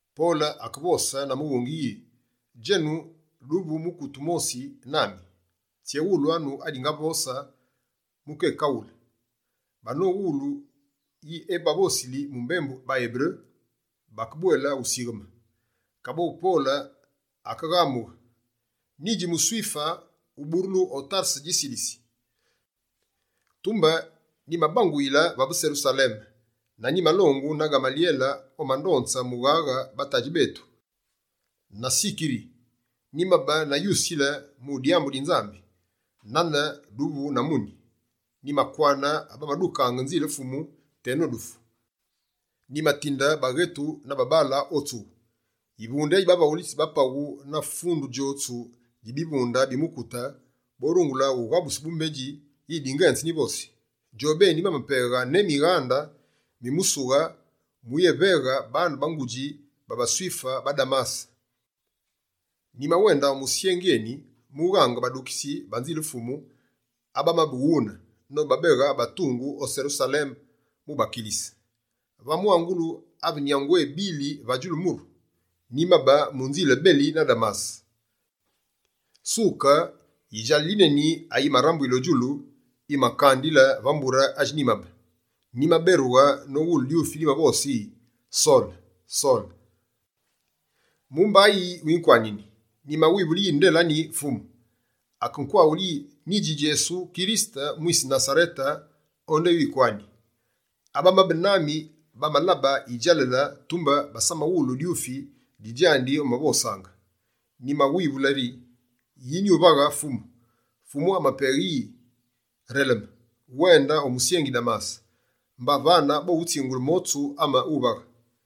Pole akevose na mughungi yi: «Djenu duvu mukute wumosi nami, tséwulwanu adingivose mu kékaghule.» Banowulu yi ebavosili mu mbembu baEberu, bakebwele usigheme. Kaboghu Pole akeghamughe: «Nyidji muSwife, uburulu o Tarese dji Silisi. Tumbe nyimabanguyile vave Serusaleme, na nyimalongu na Ghamalyele omandonze mughaghe ba tadji betu na tsikiri. Nyimabe na yusile mu dyambu di Nzambi, nane duvu na muni. Nyimakwane abamadukaange Nzile Fumu teno dufu. Nyimatinde baghetu na babaale o tsughu. Yivunde yi bavaghulitsi ba paghu na fundu djotsu dji bivunde bi mukute, borungule ughabuse bumbedji yi dingenze nyivosi. Djobeni bamapeghe ne mighande mi musughe muyéveghe baane ba ngudji ba baSwife ba Damase. Nyimawende o musyengi eni mughange badukitsi ba Nzile Fumu abamabe wune, nobabeghe batungu o Serusaleme mu bakilise. Va mwangulu ave nyangu ebile va djulu muru, nyimabe mu nzile beli na Damase. Suke, yidjalale yineni ayimarambuyile o djulu yimankandile va mbure adji nyimabe. Nyimaberughe vatsi nowulu dyufi dimavose yi: “Sole, Sole, dibandu yi winkwanini?” Nyimawivulu yi: “Nde la nyi, Fumu?” Akekwaghule yi: “Menu la Djesu mwise Nasarete, awu wikwani.” Abamabe nami bamalabe yidjalale, tumbe basamawulu dyufi di djandi omavosaange. Nyimamuwivulie rye: “Yi nyuvaghe, Fumu?” Fumu amapaghe yi: “Releme, wende o musyengi Damase. Mba vane bowutsingule motsu ame wuvaghe.”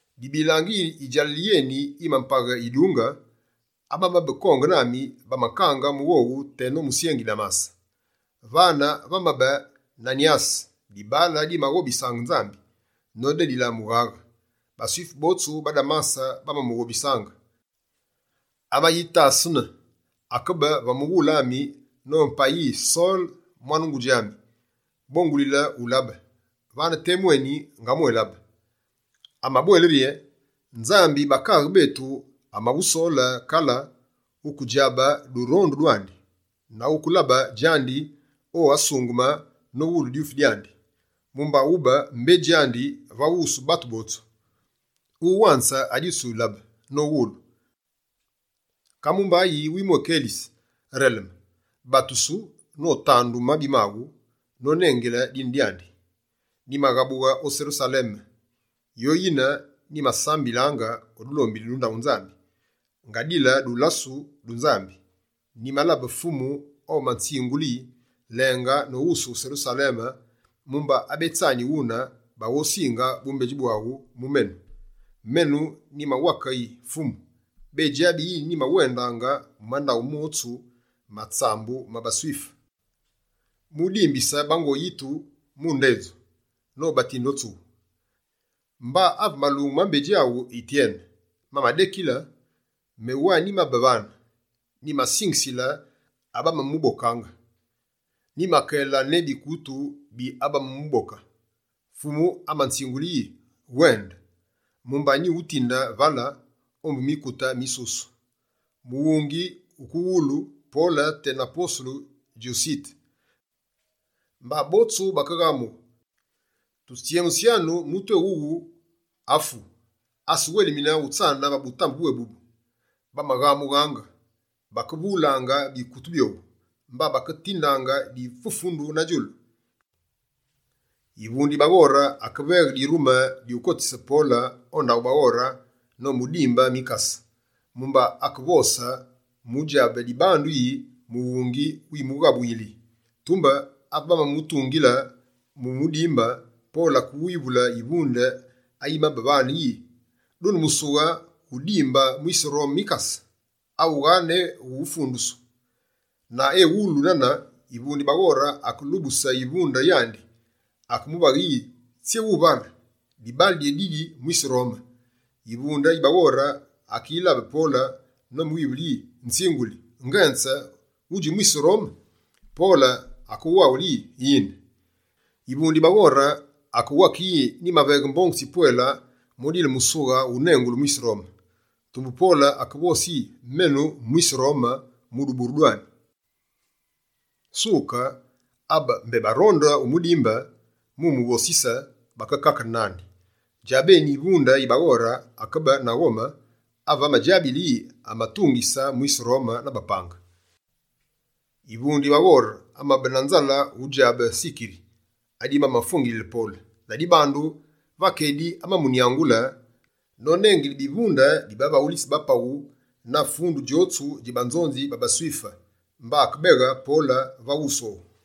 Dibilaange yi yidjalale yeni yimapaghe yidunge, abamabe konge nami, bamankaange mu dikake teno musyengi Damase. Vane vamabe Nanyase, dibaale dimaghobisaange Nzambi nodedile mughaghe. BaSwife botsu ba Damase bamamughobisaange. Amayitasene, akebe va mughule ami nopaghe yi: “Sole, mwane ngu ami, bongulile ulabe!” Vane temu eni, ngamwélabe. Amabwele yi: “Nzambi bakaaghe betu amawusole kale wukedjabe durondu dwandi, na wukelabe djandi o Asungeme nowulu dyufi dyandi. Mumba wube mbedji andi va wusu batu botsu, mu wanze adi wutsilabe nowulu. Ka mumba yi wumwékelise? Releme, batusu notandu mabi maghu, nonengile dine dyandi.”» «Nyimaghabughe o Serusaleme, yoyine nyimasambilaange o dulombili du ndaghu Nzambi, ngadile dulasu du Nzambi. Nyimalabe Fumu omanzingule yi: “Lenge noghusughe Serusaleme, mumba abetsani wune baghosinge bumbedji bwaghu mu menu.” Menu nyimawake yi: “Fumu, bédjabi yi nyimawendaange mu mandaghu motsu ma tsambu ma baSwife, mu dimbise bango yitu mu ndedju, nobatinde o tsughu. Mba ave malungu ma mbedji awu Yityene mamadekila, me wa nyimabe vane. Nyimasingisile abamamubokaange, nyimakele ne bidwaru bi abamamuboke.” Fumu amanzingule yi: “Wende, mumba nyuwutinde vale, ombu mikute misusu!”» Mughungi wuke wulu Pole tena posulu djusite. Mba botsu bakeghamughe: «Tutsyemusyanu mutu eni wughu! Afu! Asawelemine utsane va butambe bwébubu!» Bamaghamughaange, bakevulaange bikutu byowu, mba baketindaange difufundu na djulu. Yivunde yi baghore akeveghe dirume dyukotise Pole o ndaghu baghore nomudimbe mikase, mumba akevose mu udjabe dibandu yi mughungi wimughamuyili. Tumbe ave bamamutungile mu umudimbe, Pole akewivule yivunde ayimabe vane yi: «Dune musughe wu udimbe mwise Rome mikase, awughaa ne wufundusu?» Na ewulu nane, yivunde yi baghore akelubuse yivunde yandi: «Akemuvaghe yi tsyé wuvale? Dibaale dyédidi mwise Rome!» Yivunde yi baghore akeyilabe Pole nomuwivule yi: «Nzinguli, ngenze wudji mwise Rome?» Pole akewaghule yi: «Yine.» Yivunde yi baghore akewake yi: «Nyimaveghe mbongu tsipwele mu udile musughe wunengulu “mwise Rome”.» Tumbe Pole akevose yi: «Menu mwise Rome mu duburulu dwami.» Suke, abe mbé baronde umudimbe mu umuvosise, bakekakene nandi. Djabeni yivunde yi baghore akebe na ghome, ave amadjabile yi amatungise mwise Rome na bapange. Yivunde yi baghore amabe na nzale udjabe tsikiri adibamafwengilile Pole. Ladibandu, va kedi amamunyangulile nonengile bivunde bi bavaghulitsi ba paghu na fundu djotsu dji banzonzi ba baSwife. Mba akebeghe Pole va wusu owu.